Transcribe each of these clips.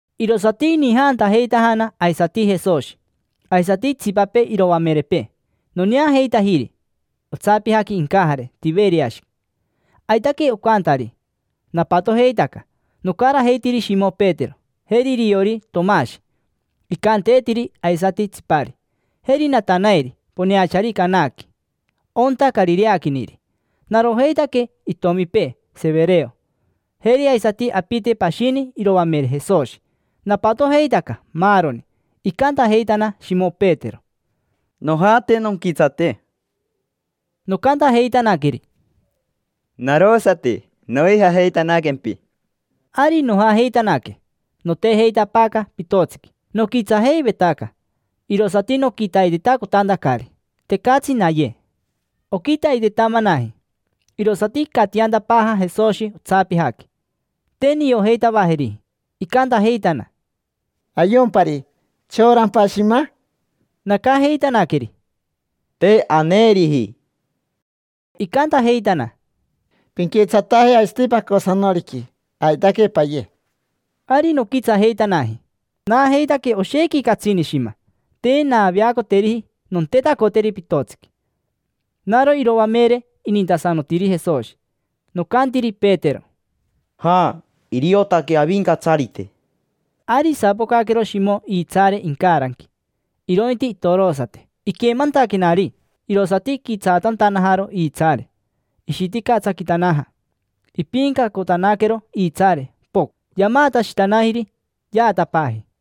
Irosati inijaantajeitajana aisati Jesoshi, aisati itsipapee iroamerepee. Noneajeitajiri otsapijaqui incajare Tiveriashi. Aitaque ocantari. Napatojeitaca, nocarajeitiri Shimo Petero, jeri iriori Tomashi: icanteetiri aisati Tsipari. Jeri Natanaeri poneachari Canaqui, onta carireaquiniri. Narojeitaque itomipee Severeo. Jeri aisati apite pashini iroamere Jesoshi. Napatojeitaca maaroni. Icantajeitana Shimo Petero: —Nojate nonquitsate. Nocantajeitanaqueri: —Narosati, noijajeitanaquempi. Ari nojajeitanaque. Notejeitapaaca pitotsiqui. Noquitsajeivetaca, irosati noquitaitetacotantacari. Tecatsi naye. Oquitaitetamanaji, irosati icatiantapaaja Jesoshi otsapijaqui. Te niojeitavajeriji. Icantajeitana: —Ayompari. ¿Chorampa shima? Nacajeitanaqueri: —Te aneeriji. Icantajeitana: —Pinquitsataje aisati pacosanoriqui, aitaque paye. Ari noquitsajeitanaji. Naajeitaque oshequi catsini shima, te naaveacoteriji nontetacoteri pitotsiqui. Naro iroamere inintasanotiri Jesoshi. Nocantiri Petero: —Ja, iriotaqueyeatsi Avincatsarite. Ari isapocaquero Shimo iitsaare incaranqui, irointi itorosate. Iquemantaquenari, irosati iquitsaatantanajaro iitsaare. Ishiticatsaquitanaja. Ipiincacotanaquero iitsaare, pocn; yamaatashitanajiri, yaatapaaji.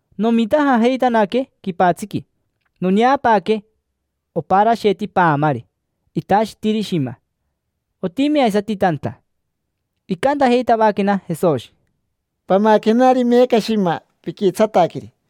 Nomitajajeitanaque quipatsiqui. Noneapaaque oparasheti paamari, itashitiri shima. Otimi aisati tanta. Icantajeitavaquena Jesoshi: —Pamaquenari meeca shima piquitsataqueri.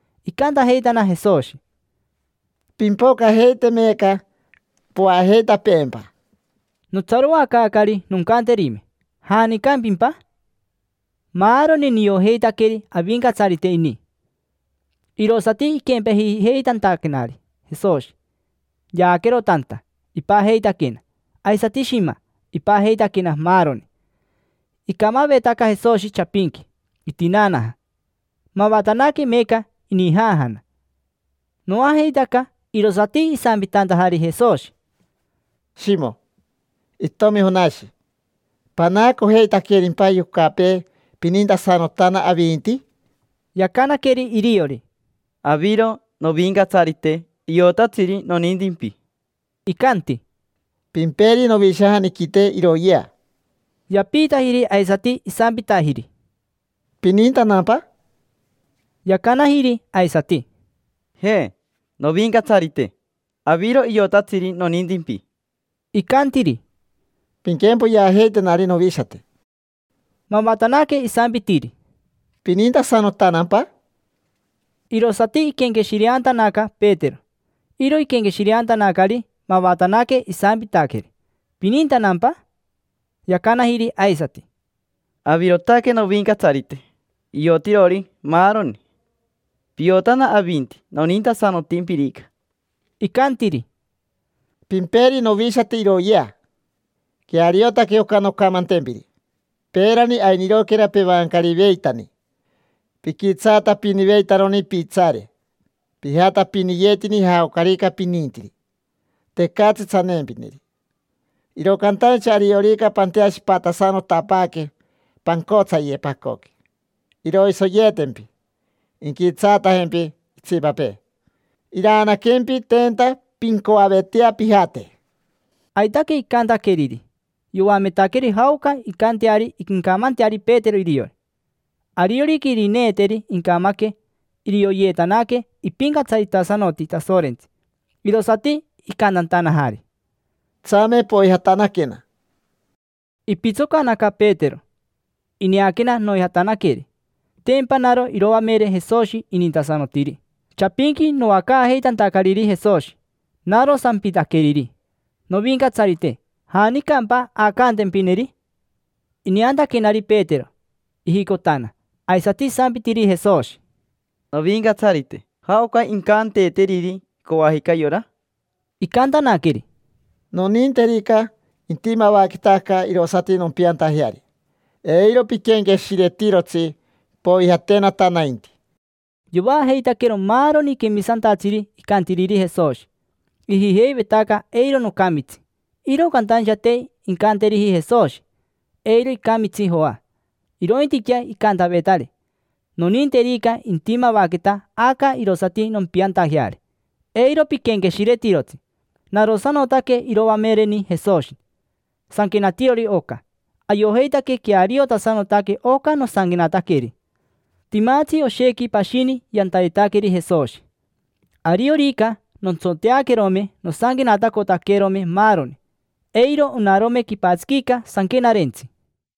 Icantajeitana Jesoshi: —Pimpocajeite meeca poajeitapeempa. Notsaroacaacari noncanterime: “¿Janicampimpa?” Maaroni niojeitaqueri Avincatsarite ini. Irosati iquempejijeitantaquenari Jesoshi. Yaaquero tanta, ipajeitaquena. Aisati shima, ipajeitaquena maaroni. Icamavetaca Jesoshi chapinqui, itinaanaja. Mavatanaque meeca inijaajana. Noajeitaca. Irosati isampitantajari Jesoshi: —Shimo, itomi Jonashi, ¿panaacojeitaquerimpa yocapee, pinintasanotana avinti? Yacanaqueri iriori: —Aviro, Novincatsarite, iotatsiri nonintimpi. Icanti: —Pimperi novishajaniquite iroyea. Yapiitajiri aisati isampitajiri: —¿Pinintanampa? Yacanajiri aisati: —Je, Novincatsarite. Aviro iotatsiri nonintimpi. Icantiri: —Pinquempoyeajeitenari novishate. Mavatanaque isampitiri: —¿Pinintasanotanampa? Irosati iquenqueshireantanaca Petero. Iro iquenqueshireantanacari, mavatanaque isampitaqueri: “¿Pinintanampa?” Yacanajiri aisati: —Avirotaque, Novincatsarite, iotirori maaroni. Piotana avinti nonintasanotimpirica. Icantiri: —Pimperi novishate iroyea. Queariotaque oca noncamantempiri: peerani, ainiroquera pevancariveitani, piquitsaatapiniveitaroni piitsaare. Pijatapiniyetini jaocarica pinintiri: tecatsi tsaneempineri. Iro cantaincha ariorica panteashiparitasanotapaaque, pancotsaye pacoqui, iroisoyeetempi, inquitsaatajempi itsipapee. Iraanaquempi tenta pincoavetea pijate. Aitaque icantaqueriri. Yoametaqueri jaoca incanteari incamanteari Petero iriori. Ariorica irineeteri incamaque, irioyeetanaque ipincatsaritasanoti Tasorentsi. Irosati icantantanajari: —Tsame, poijatanaquena. Ipitsocanaca Petero. Ineaquena noijatanaqueri, tempa naro iroamere Jesoshi inintasanotiri. Chapinqui noacaajeitantacariri Jesoshi, naro sampitaqueriri: “Novincatsarite, ¿janicampa aacantempineri?” Ineantaquenari Petero, ijicotana, aisati isampitiri Jesoshi: —Novincatsarite, ¿jaoca incanteeteriri coajica yora? Icantanaqueri: —Noninterica intimavaqueta aca irosati nompiantajeari, eiro piquenqueshiretirotsi. Poijatenata nainti. Yovaajeitaquero maaroni quemisantatsiri icantiriri Jesoshi. Ijijeivetaca eiro nocamitsi. Iro cantaincha te incanteriji Jesoshi: “Eiro icamitsi Joa”. Irointiquea icantavetari: “Noninterica intimavaqueta aca irosati nompiantajeari, eiro piquenqueshiretirotsi”. Narosanotaque iroamereni Jesoshi, sanquenatirori oca. Ayojeitaque queariotasanotaque oca nosanquenataqueri. Timatsi oshequi pashini yantayetaqueri Jesoshi. Ariorica nontsoteaquerome nosanquenatacotaquerome maaroni, eiro onarome quipatsiquica sanquenarentsi. Joa